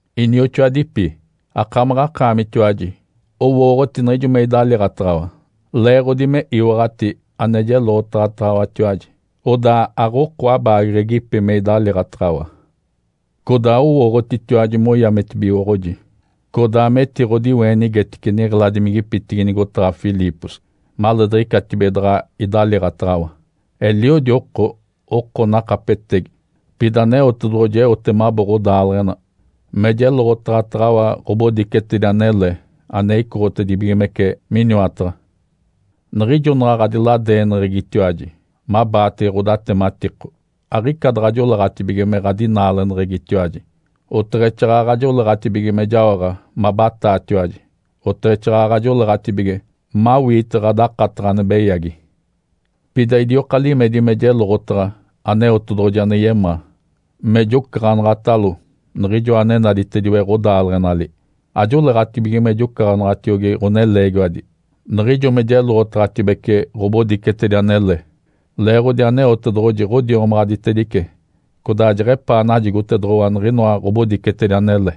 Inioxoadipi. Akamaɡ̶akaamitiwaji owooɡ̶oti niɡ̶ijo me idaliiɡ̶ataɡ̶awa, leeɡ̶odi me iwaɡ̶ati ane jeloɡ̶otaɡ̶ataɡ̶awatiwaji, odaa aɡ̶oko abaageɡ̶egipi me idaliiɡ̶ataɡ̶awa. Codaa owooɡ̶otitiwaji moyametibigoɡ̶oji, codaa metiɡ̶odiweenigetice niɡ̶eladimigipitigi nigotaɡ̶a Filipos maleediɡ̶icatibige daɡ̶a idaliiɡ̶ataɡ̶awa. Eliodi oko, oko nakapetegi, pida Aneotedoɡ̶oji eote mabo ɡ̶odaaleɡ̶ena me jeloɡ̶otaɡ̶ataɡ̶awa ɡ̶obodicetedi anele ane icoɡ̶otibigimece miniwataɡ̶a. Niɡ̶ijo naɡ̶a ɡ̶adiladeeneɡ̶egitiwaji mabaatege ɡ̶odatematiko, aɡ̶ica daɡ̶a joleeɡ̶atibige me ɡ̶adinaaleneɡ̶egitiwaji, oteɡ̶exaaɡ̶aɡ̶a joleeɡ̶atibige me jaoɡ̶a mabataatiwaji, oteɡ̶exaaɡ̶aɡ̶a joleeɡ̶atibige mawiite ɡ̶adakataɡ̶a ane beyagi. Pida idioka limedi me jeloɡ̶otaɡ̶a Aneotedoɡ̶oji ane yemaa, me jocaɡ̶anaɡ̶atalo, Niɡ̶ijoa ane naditediwe ɡ̶odaaleɡ̶enali. Ajoleeɡ̶atibige me jocaɡ̶anaɡ̶atiogi ɡ̶oneleegiwadi niɡ̶ijo me jeloɡ̶otaɡ̶atedibece ɡ̶obodicetedi anele, leeɡ̶odi Aneotedoɡ̶oji ɡ̶odiomaɡ̶aditedice codaa jeɡ̶epaa najigotedoɡ̶owa niɡ̶inoa ɡ̶obodicetedi anele.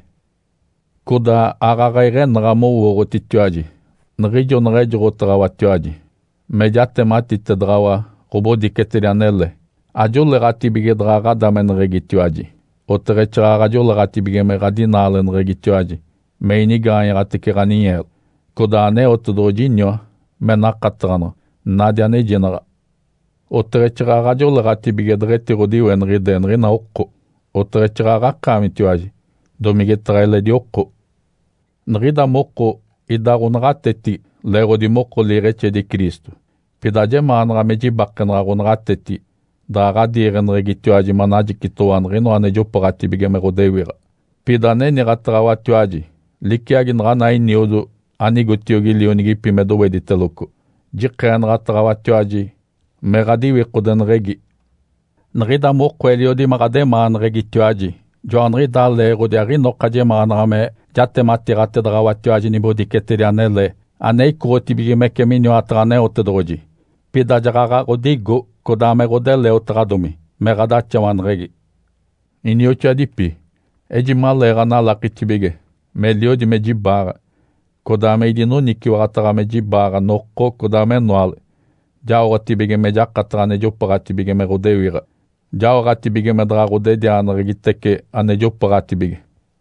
Codaa aaɡ̶aɡ̶a iɡ̶enaɡ̶a mowooɡ̶otitiwaji niɡ̶ijo naɡ̶a ejoɡ̶otaɡ̶awatiwaji me jatematitedaɡ̶awa ɡ̶obodicetedi anele, ajoleeɡ̶atibige daɡ̶a ɡ̶adameneɡ̶egitiwaji, oteɡ̶exaaɡ̶aɡ̶a joleeɡ̶atibige me ɡ̶adinaaleneɡ̶egitiwaji me inigaanyaɡ̶atece ɡ̶aninyeelo. Codaa Aneotedoɡ̶oji iniwa me nakataɡ̶anaɡ̶a nadi anejinaɡ̶a. Oteɡ̶exaaɡ̶aɡ̶a joleeɡ̶atibige deɡ̶etiɡ̶odiweniɡ̶ide niɡ̶ina oko, oteɡ̶exaaɡ̶aɡ̶a akaamitatiwaji, domigetaɡ̶a eledi oko. Niɡ̶ida moko ida ɡ̶onaɡ̶atetigi leeɡ̶odi moko liiɡ̶exedi Cristo. Pida ajemaanaɡ̶a me jibakenaɡ̶a ɡ̶onaɡ̶atetigi daɡ̶a ɡ̶adiiɡ̶eneɡ̶egitiwaji manajicitoɡ̶owa niɡ̶inoa ane jopooɡ̶atibige me ɡ̶odewiɡ̶a. Pida aniniɡ̶ataɡ̶awatiwaji liciagi naɡ̶ana eniodo anigotiogi lionigipi me dowediteloco, jikeenaɡ̶ataɡ̶awatiwaji me ɡ̶adiwikodeneɡ̶egi. Niɡ̶ida moko eliodi me ɡ̶ademaaneɡ̶egitiwaji. Joaniɡ̶idaa leeɡ̶odi aɡ̶inoka jemaanaɡ̶a me jatematiiɡ̶atedaɡ̶awatiwaji nibodicetedi anele ane icoɡ̶otibigimece miniwataɡ̶a Aneotedoɡ̶oji, pida jaɡ̶aɡ̶a ɡ̶odigo codaa me ɡ̶odeleotaɡ̶adomi me ɡ̶adaxawaneɡ̶egi. Inioxoadipi. Ejimaleeɡ̶analakitibige meliodi me jibaaɡ̶a, codaa me idinoniciwaɡ̶ataɡ̶a me jibaaɡ̶a noko, codaa menoale jaoɡ̶atibige me jakataɡ̶a ane jopooɡ̶atibige me ɡ̶odewiɡ̶a, jaoɡ̶atibige me daɡ̶a ɡ̶odedianeɡ̶egitece ane jopooɡ̶atibige,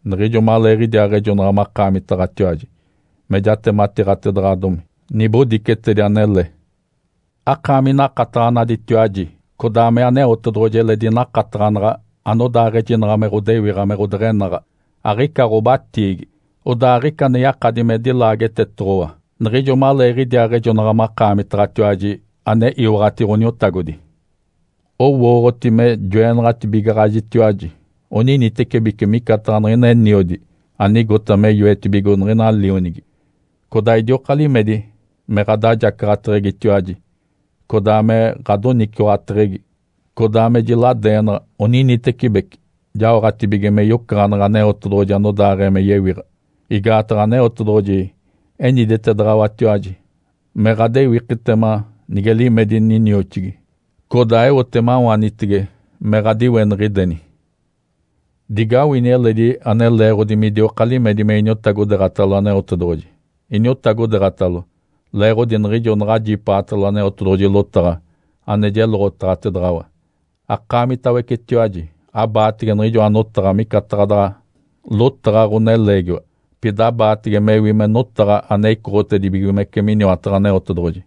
niɡ̶ijo maleeɡ̶idiaaɡ̶ejonaɡ̶a makaamitaɡ̶atiwaji me jatematiiɡ̶atedaɡ̶adomi nibodicetedi anele. Akaami nakataɡ̶anaditiwaji, codaa me Aneotedoɡ̶oji eledi nakataɡ̶anaɡ̶a anodaaɡ̶ejinaɡ̶a me ɡ̶odewiɡ̶a me ɡ̶odeɡ̶enaɡ̶a, aɡ̶ica ɡ̶obatiigi, odaa aɡ̶ica ane yakadi me dilaagetetoɡ̶owa niɡ̶ijo maleeɡ̶idiaaɡ̶ejonaɡ̶a makaamitaɡ̶atiwaji ane iwaɡ̶ati Ǥoniotagodi. Owooɡ̶oti me joenaɡ̶atibigaɡ̶ajitiwaji oninitecibeci micataɡ̶a niɡ̶ina eniodi anigota me yoetibigo niɡ̶ina lionigi. Codaa idioka limedi me ɡ̶adajacaɡ̶ateɡ̶egitiwaji, codaa me ɡ̶adoniciwaɡ̶ateɡ̶egi, codaa me jiladeenaɡ̶a oninitecibeci jaoɡ̶atibige me yocaɡ̶aneɡ̶e Aneotedoɡ̶oji anodaaɡ̶ee me yewiɡ̶a. Igaataɡ̶a Aneotedoɡ̶oji eniditedaɡ̶awatiwaji me ɡ̶adewikitema nige limedi ninioxigi, codaa eote mawanitege me ɡ̶adiweniɡ̶ideni. Digawini eledi ane leeɡ̶odi midioka limedi me iniotagodeeɡ̶atalo Aneotedoɡ̶oji. Iniotagodeeɡ̶atalo leeɡ̶odi niɡ̶ijo naɡ̶ajipaatalo Aneotedoɡ̶oji lotaɡ̶a ane jeloɡ̶otaɡ̶atedaɡ̶awa, akaamitawecetiwaji aɡ̶abaatege niɡ̶ijoa notaɡ̶a micataɡ̶a daɡ̶a lotaɡ̶a ɡ̶oneleegiwa, pida abaatege mewi me notaɡ̶a ane icoɡ̶otedibigimece miniwataɡ̶a Aneotedoɡ̶oji.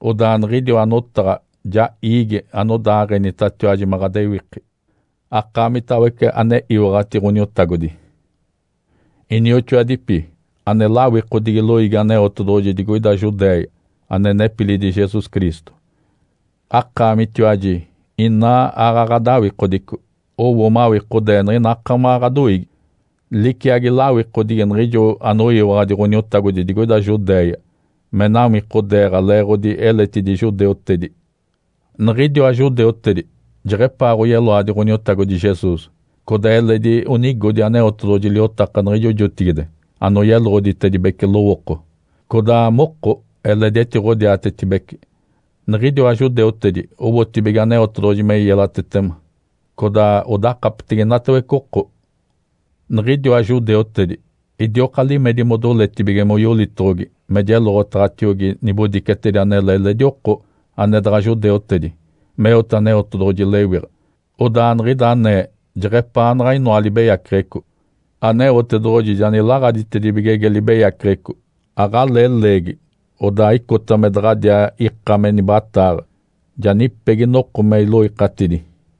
Odaa niɡ̶idiwa notaɡ̶a ja iigi anodaaɡ̶enitatiwaji me ɡ̶adewiki, akaamitawece ane iwaɡ̶ati Ǥoniotagodi. Inioxoadipi. Ane lawikodigi loiigi Aneotedoɡ̶oji digoida Judéia ane nepilidi Jesus Cristo, akaamitiwaji inaa aaɡ̶aɡ̶a ɡ̶adawikodico. Owo mawikodee niɡ̶ina akamaɡ̶a ɡ̶adoiigi, liciagi lawikodigi niɡ̶ijo anoyiwaɡ̶adi Ǥoniotagodi digoida Judéia me nawikodeeɡ̶a leeɡ̶odi eletidi judeutedi. Niɡ̶idiwa judeutedi jeɡ̶epaa oyeloadi Ǥoniotagodi Jesus, codaa eledi onigodi Aneotedoɡ̶oji liotaka niɡ̶ijo jotigide anoyeloɡ̶oditedibece lowooko. Codaa moko eledi etiɡ̶odiatetibece. Niɡ̶idiwa judeutedi owotibige Aneotedoɡ̶oji me yelatetema, codaa odakapetege inatawece oko. Niɡ̶idiwa judeutedi idioka limedi modoletibige moyolitoɡ̶ogi me jeloɡ̶otaɡ̶atiogi nibodicetedi anele eledi oko ane daɡ̶a judeutedi meote Aneotedoɡ̶oji lewiɡ̶a. Odaa niɡ̶ida anee jeɡ̶epaanaɡ̶a inoa libeyaceɡ̶eco. Aneotedoɡ̶oji ja nilaɡ̶aditedibigege libeyaceɡ̶eco, aɡ̶alee leegi odaa icota me daɡ̶adiaa ika me nibataaɡ̶a. Ja nipegi noko me iloikatidi.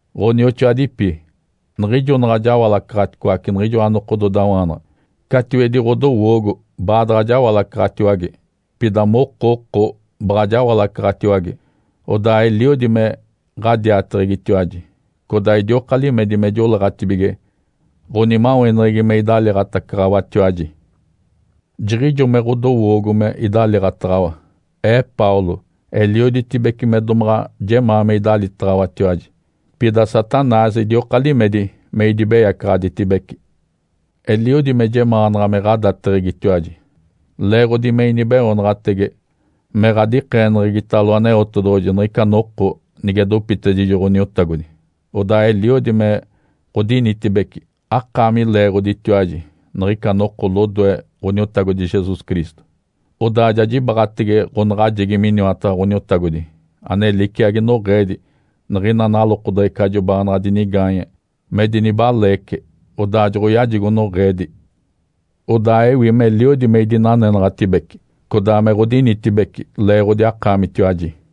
Ǥonioxoadipi. Niɡ̶ijo naɡ̶a jawalacaɡ̶aticoace niɡ̶ijoa nokododawaanaɡ̶a, catiwedi ɡ̶odowoogo baadaɡ̶a jawalacaɡ̶atiwage, pida moko oko baɡ̶a jawalacaɡ̶atiwage. Odaa eliodi me ɡ̶adiateɡ̶egitiwaji, codaa idioka limedi me joleeɡ̶atibige ɡ̶onimaweneɡ̶egi me idaliiɡ̶atacaɡ̶awatiwaji. Jiɡ̶ijo me ɡ̶odowoogo me idaliiɡ̶ataɡ̶awa. Ee Paulo, elioditibece me domaɡ̶a jemaa me idalitaɡ̶awatiwaji, pida Satanás idioka limedi me idibeyacaɡ̶aditibece. Eliodi me jemaanaɡ̶a me ɡ̶adateɡ̶egitiwaji, leeɡ̶odi me inibeoonaɡ̶atege me ɡ̶adikeeneɡ̶egitalo Aneotedoɡ̶oji niɡ̶ica noko nige dopitedijo Ǥoniotagodi, odaa eliodi me ɡ̶odinitibece akaami leeɡ̶oditiwaji niɡ̶ica noko lodoe Ǥoniotagodi Jesus Cristo. Odaa ja jibaɡ̶atege ɡ̶onaɡ̶ajegi miniwataɡ̶a Ǥoniotagodi ane liciagi noɡ̶eedi niɡ̶ina nalokodeɡ̶ecajo baanaɡ̶a dinigaanye me dinibaleece, odaa joɡ̶oyajigo noɡ̶eedi. Odaa ewi meliodi me idinanenaɡ̶atibece codaa me ɡ̶odinitibece leeɡ̶odi akaamitiwaji.